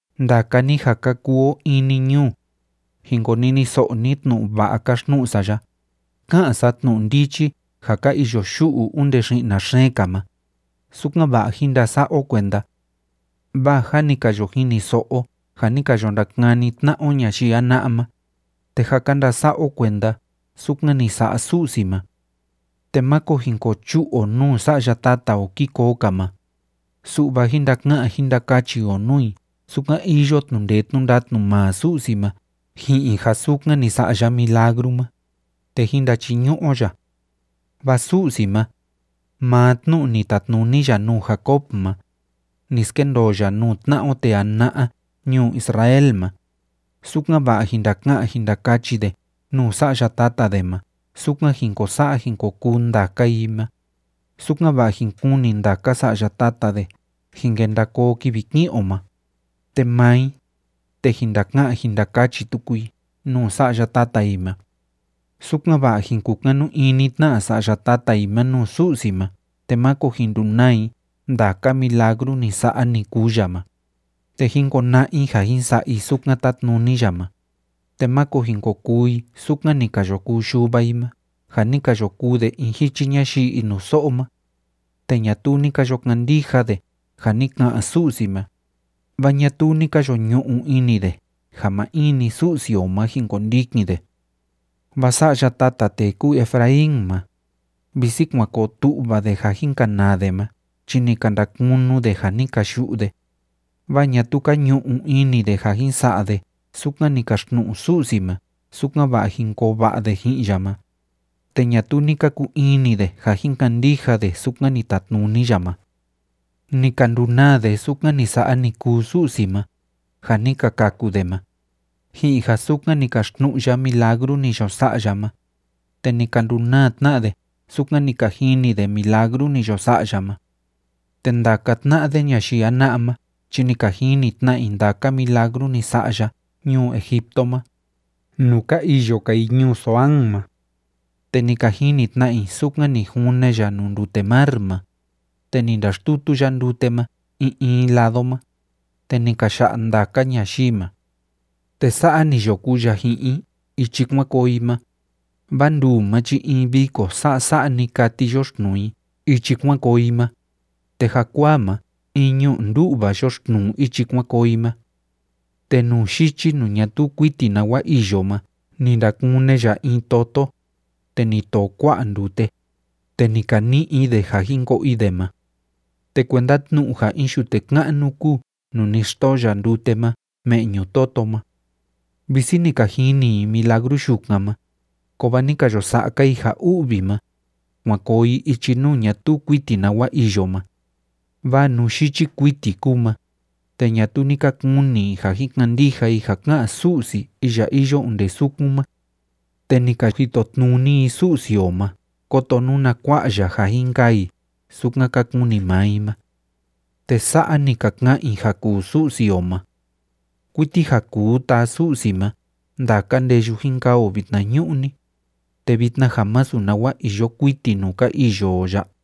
Ndaka ni ja ka kuu o in‑ni ñuu, jin koniniso'o ni tnu'u va'a káxtnu'u sa ya. Ká'an sa tnu'u ndichi ja ka iyo yu'u onde xi'na xeen‑ka ma, sukan‑va'a jín ndasa'a o kuenda. Vaa jâ ni ka yo jiniso'o o ja ni ka yo ndakani tna'a o ñayii jana'a ma, te jâ ka ndasa'a o kuenda sukan ni sa'a Su'si ma. Te máko jin ko chu'u o nuu sa'ya tata o kii koo‑ka ma, su'va jín ndaka'an jín ndakachi o nuu i sukan iyo tnu'u ndee tnu'u ndatnu maa Su'si ma ji'in ja sukan ni sa'a ya milagru ma, te jín ndachiñu'u o ya. Vaa Su'si ma, maa tnu'u ni tatnuni ya nuu Jacob ma, ni skendoo ya nuu tna'a o tee jana'a ñuu Israel ma, sukan‑va'a jin ndaka'an jin ndakachi de nuu sa'ya tata de ma sukan jin ko sa'a jin ko kuu ndaka i ma, sukan‑va'a jin kuni ndaka sa'ya tata de jin kenda koo kivi ki'in o ma, te maa i, te jin ndaka'an jin ndakachi tuku i nuu sa'ya tata i ma, sukan‑va'a jin kukanu ini tna sa'ya tata i ma nuu Su'si ma te máko jin ndunaa i ndaka milagru ni sa'a, ni kuu ya ma, te jín kona'a i ja jin sa'a i sukan tátnuni ya ma, te máko jin ko kuu i sukan ni ka yo kuu yuva i ma ja ni ka yo kuu de in jichi ñayii inuso'o ma, te ñatuu ni ka yo kandija de ja ni ka'an Su'si ma, vaa ñatuu ni ka yo ñu'u ini de ja maa in‑ni Su'si o ma jin kondikin de. Vaa sa'ya tata tee kúu Efraín ma, visi kuan koo tu'va de ja jin kanaa de ma chi ni ka ndakunu de ja ni ka yu'u de, vaa ñatuu ka ñu'u ini de ja jin sa'a de sukan ni kaxtnu'u Su'si ma sukan‑va'a jin koo va'a de ji'in ya ma, te ñatuu ni ka kuu ini de ja jin kandija de sukan ni tatnuni ya ma. Ni ka ndunaa de sukan ni sa'a ni kuu Su'si ma, ja ni ka kaku de ma, ji'in ja sukan ni kaxtnu'u ya milagru ni yo sa'a ya ma, te ni ka ndunaa tna de sukan ni ka jini de milagru ni yo sa'a ya ma. Te ndaka tna'a de ñayii jana'a ma chi ni ka jini tna i ndaka milagru ni sa'a ya ñuu Egipto ma, nuu ka iyo‑ka i ñuu Zoán ma. Te ni ka jini tna i sukan ni june ya nuu ndute mar ma, te ni ndaxtutu ya ndute ma in in lado ma, te ni ka ya'a ndaka ñayii ma. Te sa'a ni yo kuu ya ji'in i ichi kuan koo i ma, vaa nduu ma chi in viko sasa'a‑ni kati yoxtnuu i ichi kuan koo i ma, te jakuaa ma in ñu'u ndu'va yoxtnuu ichi kuan koo i ma. Te nuu yichi nuu ñatuu kuiti nawa iyo ma ni ndakune ya in toto, te ni too kua'a ndute, te ni ka ni'i i de ja jin ko'o i de ma. Te kuenda tnu'u ja in yute ka'nu kúu nuu ni xtoo ya ndute ma me'ñu toto ma. Visi ni ka jini i milagru yukan ma, kovaa ni ka yo sa'a‑ka i ja u'vi ma, kuan koo i ichi nuu ñatuu kuiti nawa iyo ma, vaa nuu yichi kuiti kúu ma, te ñatuu ni ka kuni i ja jin kandija i ja ká'an Su'si iya iyo onde sukun ma. Te ni ka jitotnuni i Su'si o ma kóto nuna kua'a ya ja jin kaa i sukan ka kuni maa i ma. Te sa'a ni ka ka'an i ja kuu Su'si o ma: “¿Kuiti ja kuu taa Su'si ma ndaka ndeyu jin kaa o vitnañu'ni, te vitna ja masu nawa iyo kuiti nuu ka iyo o ya?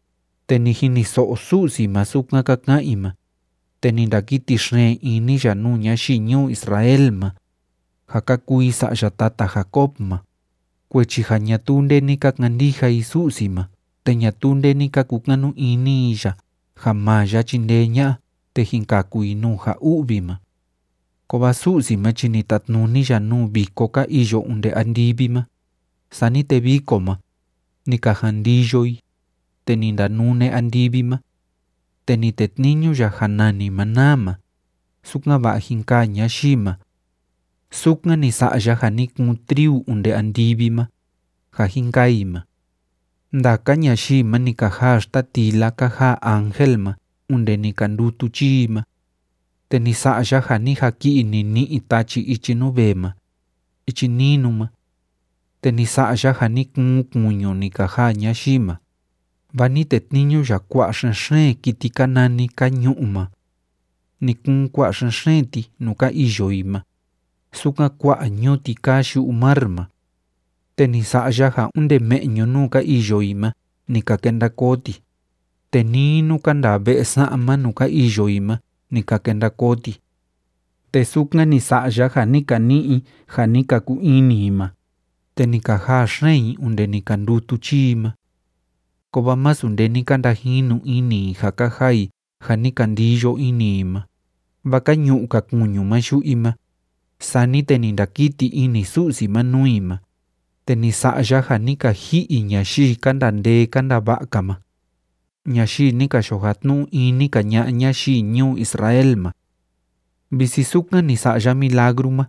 Te ni jiniso'o Su'si ma sukan ka ka'an i ma, te ni ndakiti xeen ini ya nuu ñayii ñuu Israel ma, ja ka kuu i sa'ya tata Jacob ma, kuechi ja ñatuu nde ni ka kandija i Su'si ma te ñatuu nde ni ka kukanu ini i ya ja maa ya chindee ña'a te jin kaku i nuu ja u'vi ma. Kovaa Su'si ma chi ni tatnuni ya nuu viko ka iyo onde andivi ma, sani te viko ma, ni ka jan ndiyo i, te ni ndanune andivi ma. Te ni tetniñu ya ja nani maná ma, sukan‑va'a jin kaa ñayii ma. Sukan ni sa'a ya ja ni kuun triu onde andivi ma, ja jin kaa i ma. Ndaka ñayii ma ni ka jaa xtatila ka jaa ángel ma onde ni ka ndutu chii i ma. Te ni sa'a ya ja ni jaki'i nini'i tachi ichi nuu vee ma, ichi ninu ma. Te ni sa'a ya ja ni kuun kuñu ni ka jaa ñayii ma, vaa ni tetniñu ya kua'a xen‑xeen kiti ka nani kañu'u ma. Ni kuun kua'a xen‑xeen ti nuu ka iyo i ma, sukan kua'a ñuti kaa yu'u mar ma. Te ni sa'a ya ja onde me'ñu nuu ka iyo i ma ni ka kenda koo ti, te nii nuu ka ndaa ve'e sa'ma nuu ka iyo i ma ni ka kenda koo ti. Te sukan ni sa'a ya ja ni ka ni'i i ja ni ka kuu ini i ma, te ni ka jaa xeen i onde ni ka ndutu chii i ma. Kovaa masu nde ni ka ndajinu ini i ja ka jaa i ja ni ka ndiyo ini i ma, vaa ka ñu'u‑ka kuñu ma yu'u i ma, sani te ni ndakiti ini Su'si ma nuu i ma, te ni sa'a ya ja ni ka ji'i ñayii ka ndaa ndee ka ndaa va'a‑ka ma, ñayii ni ka yo jatnu'u ini‑ka ña'a ñayii ñuu Israel ma. Visi sukan ni sa'a ya milagru ma,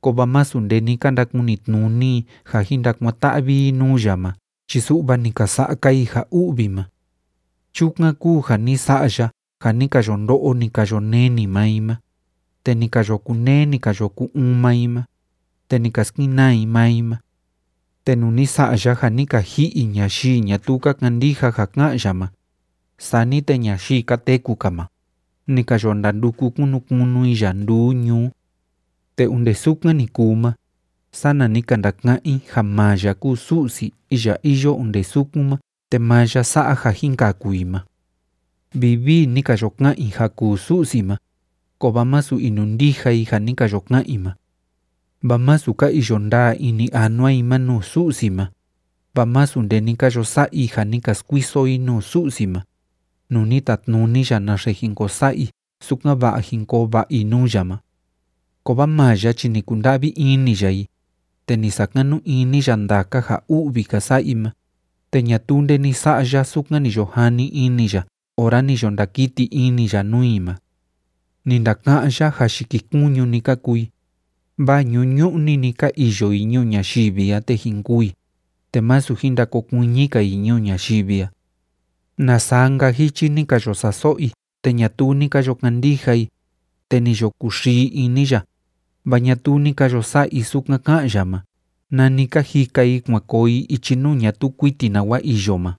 kovaa masu nde ni ka ndakunitnuni i ja jin ndakuan‑ta'vi i nuu ya ma chi su'va ni ka sa'a‑ka i ja u'vi ma. Chukan kúu ja ni sa'a ya ja ni ka yo ndo'o, ni ka yo neni maa i ma, te ni ka yo kuneé, ni ka yo ku‑uun maa i ma, te ni ka skenaa i maa i ma. Te nuu ni sa'a ya ja ni ka ji'i ñayii ñatuu ka kandija ja ká'an ya ma, sani te ñayii ka teku‑ka ma, ni ka yo ndanduku kunu kunu i ya nduu ñuu. Te onde sukan ni kuu ma, sana ni ka ndaka'án i ja maa ya kúu Su'si iya iyo onde sukun ma te maa ya sa'a ja jin kaku i ma. Vivii ni ka yo ka'an i ja kuu Su'si ma, kovaa masu inundija i ja ni ka yo ka'an i ma. Vaa másu ka iyo ndaa ini anua i ma nuu Su'si ma, vaa másu nde ni ka yo sa'a i ja ni ka skuiso i nuu Su'si ma, nuu ni tatnuni ya naxe jin ko sa'a i sukan‑va'a jin koo va'a i nuu ya ma. Kovaa maa ya chi ni kunda'vi ini ya i, te ni sakanu ini ya ndaka ja u'vi ka sa'a i ma, te ñatuu nde ni sa'a ya sukan ni yo jani ini ya ora ni yo ndakiti ini ya nuu i ma. Ni ndaka'án ya ja yikikuñu‑ni ka kuu i, vaa ñuñu'ni‑ni ka iyo i ñuu ñayivi a te jin kûu i, te másu jin ndakokuiñi‑ka i ñuu ñayivi a. ¡Na saa‑nka jichi ni ka yo sa'a so'o i te ñatuu ni ka yo kandija i, te ni yo kuxii ini ya, vaa ñatuu ni ka yo sa'a i sukan ká'an ya ma nani ka jika i kuan koo i ichi nuu ñatuu kuiti nawa iyo ma!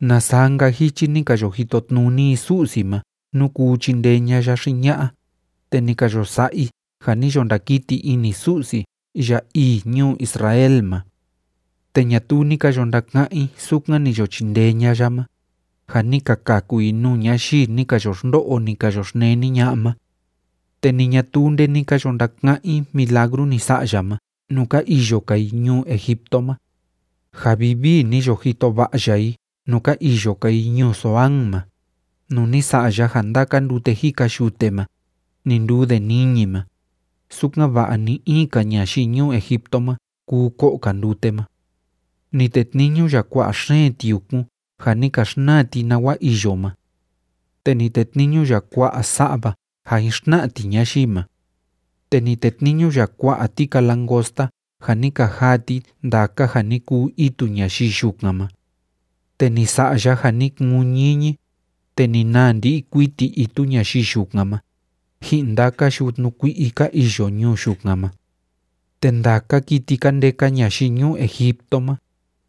¡Na saa‑nka jichi ni ka yo jitotnuni i Su'si ma nú kuu chindee ña'a ya xi ña'a, te ni ka yo sa'a i ja ni yo ndakiti ini Su'si iya ii ñuu Israel ma! Te ñatuu ni ka yo ndaka'án i sukan ni yo chindee ña'a ya ma, ja ni ka kaku i nuu ñayii ni ka yo xndo'o, ni ka yo xneni ña'a ma. Te ni ñatuu nde ni ka yo ndaka'án i milagru ni sa'a ya ma nuu ka iyo‑ka i ñuu Egipto ma, ja vivii ni yo jito va'a ya i nuu ka iyo‑ka i ñuu Zoán ma, nuu ni sa'a ya ja ndaka ndute jika yute ma, ni nduu de niñi ma, sukan‑va'a ni‑in‑ka ñayii ñuu Egipto ma kuu ko'o‑ka ndute ma. Ni tetniñu ya kua'a xeen tiukun ja ni ka xnaa ti nawa iyo ma. Te ni tetniñu ya kua'a sa'va ja jin xtna'a ti ñayii ma. Te ni tetniñu ya kua'a tika langosta ja ni ka jaa ti ndaka ja ni kuu itu ñayii yukan ma. Te ni sa'a ya ja ni kuun ñiñi, te ni naa ndi'i kuiti itu ñayii yukan ma, ji'in ndaka yutnu kui'i ka iyo ñuu yukan ma. Te ndaka kiti ka ndeka ñayii ñuu Egipto ma,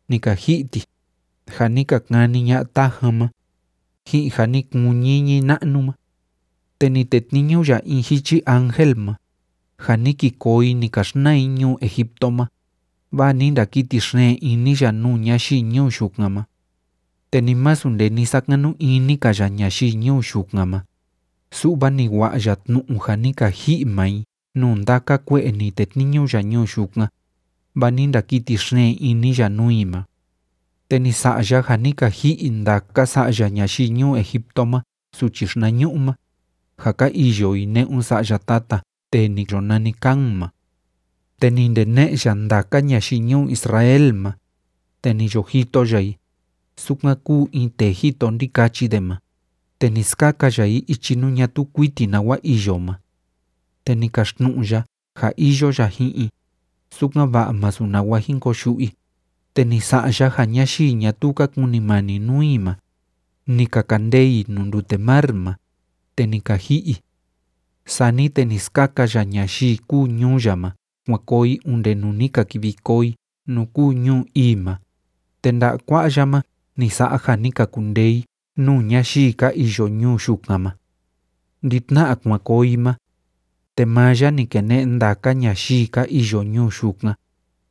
ni ka ji'i ti, ja ni ka kani ña'a tajan ma, ji'in ja ni kuun ñiñi na'nu ma. Te ni tetniñu ya in jichi ángel ma, ja ni ki koo i ni ka xnaa i ñuu Egipto ma, vaa ni ndakiti xeen ini ya nuu ñayii ñuu yukan ma. Te ni masu nde ni sakanu ini‑ka ya ñayii ñuu yukan ma, su'va ni wa'a ya tnu'u ja ni ka ji'i maa i nuu ndaka kue'e ni tetniñu ya ñuu yukan, vaa ni ndakiti xeen ini ya nuu i ma. Te ni sa'a ya ja ni ka ji'i ndaka sa'ya ñayii ñuu Egipto ma suchi yii xinañu'u ma, ja ka iyo i ne'un sa'ya tata tee ni yo nani Cam ma. Te ni ndene'e ya ndaka ñayii ñuu Israel ma, te ni yo jito ya i, sukan kúu in tee jito ndikachi de ma, te ni skaka ya i ichi nuu ñatuu kuiti nawa iyo ma. Te ni kaxtnu'u ya ja iyo ya ji'in i, sukan‑va'a masu nawa jin koyu'u i, te ni sa'a ya ja ñayii ñatuu ka kunimani nuu i ma, ni ka kandee i nuu ndute mar ma, te ni ka ji'i i. Sani te ni skaka ya ñayii kúu ñuu ya ma kuan koo i onde ni ka kivi koo i nuu kúu ñuu ii ma, te nda'a kua'a ya ma ni sa'a ja ni ka kundee i nuu ñayii ka iyo ñuu yukan ma. Ndi‑tna'a kuan koo i ma, te maa ya ni kene'e ndaka ñayii ka iyo ñuu yukan,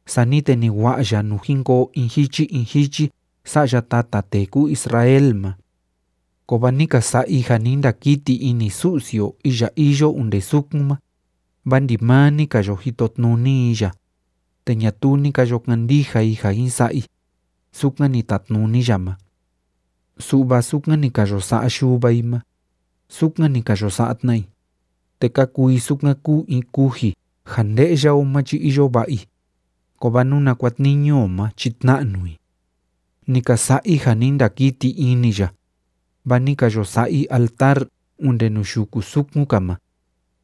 sani te ni wa'a ya nuu jin koo in jichi in jichi sa'ya tata tee kúu Israel ma. Kovaa ni ka sa'a i ja ni ndakiti ini Su'si o iya iyo onde sukun ma, vaa ndimaa ni ka yo jitotnuni i ya, te ñatuu ni ka yo kandija i ja jin sa'a i sukan ni tatnuni ya ma. Su'va sukan ni ka yo sa'a yuva i ma, sukan ni ka yo sa'a tna i, te ka kuu i sukan kúu in kuji ja nde'ya o ma chi iyo va'a i, kovaa nuna kuatniñu o ma chi tna'nu i. Ni ka sa'a i ja ni ndakiti ini ya, vaa ni ka yo sa'a i altar onde nuu yuku sukun‑ka ma,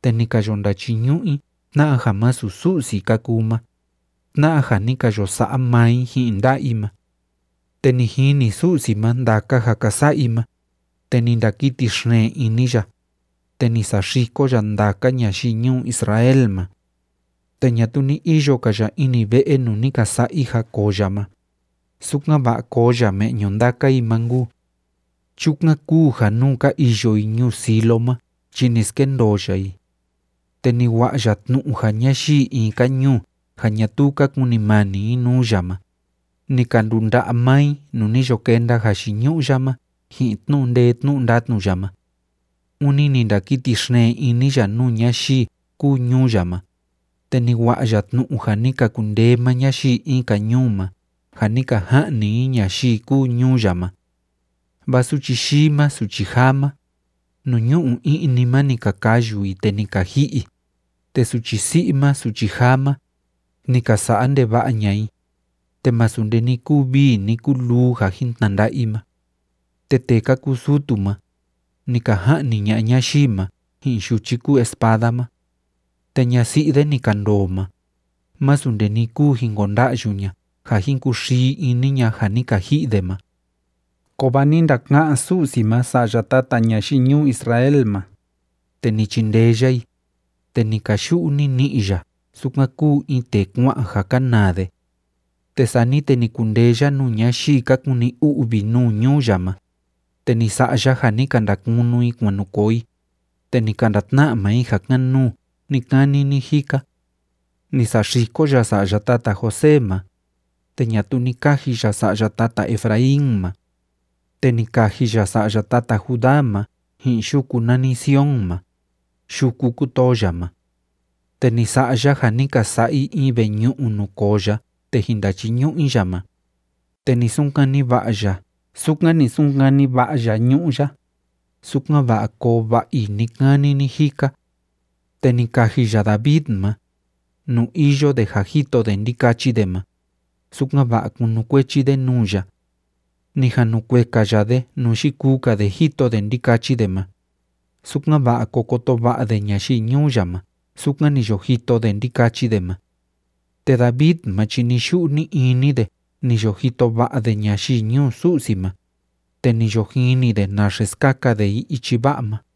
te ni ka yo ndachiñu'u i tna'a ja masu Su'si ka kuu ma, tna'a ja ni ka yo sa'a maa i ji'in nda'a i ma. Te ni jini Su'si ma ndaka ja ka sa'a i ma, te ni ndakiti xeen ini ya, te ni saxiko ya ndaka ñayii ñuu Israel ma. Te ñatuu ni iyo‑ka ya ini ve'e nuu ni ka sa'a i ja koo ya ma, sukan‑va'a koo ya me'ñu ndaka i ma nkuu. Chukan kúu ja nuu ka iyo i ñuu Silo ma chi ni skendoo ya i. Te ni wa'a ya tnu'u ja ñayii in‑ka ñuu ja ñatuu ka kunimani i nuu ya ma, ni ka ndunda'a maa i nuu ni yo kenda jayiñu'u ya ma ji'in tnu'u ndee tnu'u ndatnu ya ma. Ûni ni ndakiti xeen ini ya nuu ñayii kúu ñuu ya ma, te ni wa'a ya tnu'u ja ni ka kundee maa ñayii in‑ka ñuu ma ja ni ka ja'ni i ñayii kúu ñuu ya ma. Vaa suchi yii ma suchi jaa ma, nuu ñu'u i'ni ma ni ka kayu i, te ni ka ji'i i, te suchi si'i ma suchi jaa ma, ni ka sa'a ndeva'a ña'a i, te masu nde ni kuu vii ni kuu luu ja jin tnanda'a i ma. Te tee ka kuu sutu ma, ni ka ja'ni ña'a ñayii ma ji'in yuchi kúu espada ma. Te ñasi'i de ni ka ndoo ma, masu nde ni kuu jin konda'yu ña ja jin kuxii ini ña ja ni ka ji'i de ma. Kovaa ni ndaka'án Su'si ma sa'ya tata ñayii ñuu Israel ma, te ni chindee ya i, te ni kayu'u nini'i ya sukan kúu in tee kua'an ja kanaa de. Te sani te ni kundee ya nuu ñayii ka kuni u'vi nuu ñuu ya ma, te ni sa'a ya ja ni ka ndakunu i kuan nu koo i, te ni ka ndatna'a maa i ja kan‑nuu ni‑kani ni‑jika. Ni saxiko ya sa'ya tata José ma, te ñatuu ni kaji ya sa'ya tata Efraín ma. Te ni kaji ya sa'ya tata Judá ma ji'in yuku nani Sion ma, yuku kutoo ya ma. Te ni sa'a ya ja ni ka sa'a i in veñu'u nuu koo ya te jin ndachiñu'u i ya ma, te ni sunkani va'a ya sukan ni sunkani va'a ya ñu'ú ya, sukan‑va'a koo va'a i ni‑kani ni‑jika. Te ni kaji ya David ma, nuu iyo de ja jito de ndikachi de ma, sukan‑va'a kunukuechi de nuu ya. Ni jan nu kueka ya de nuu yikuu‑ka de jito de ndikachi de ma, sukan‑va'a ko koto va'a de ñayii ñuu ya ma sukan ni yo jito de ndikachi de ma. Te David ma chi ni‑yu'u ni‑ini de ni yo jito va'a de ñayii ñuu Su'si ma, te ni yo jini de naxe skaka de i ichi va'a ma.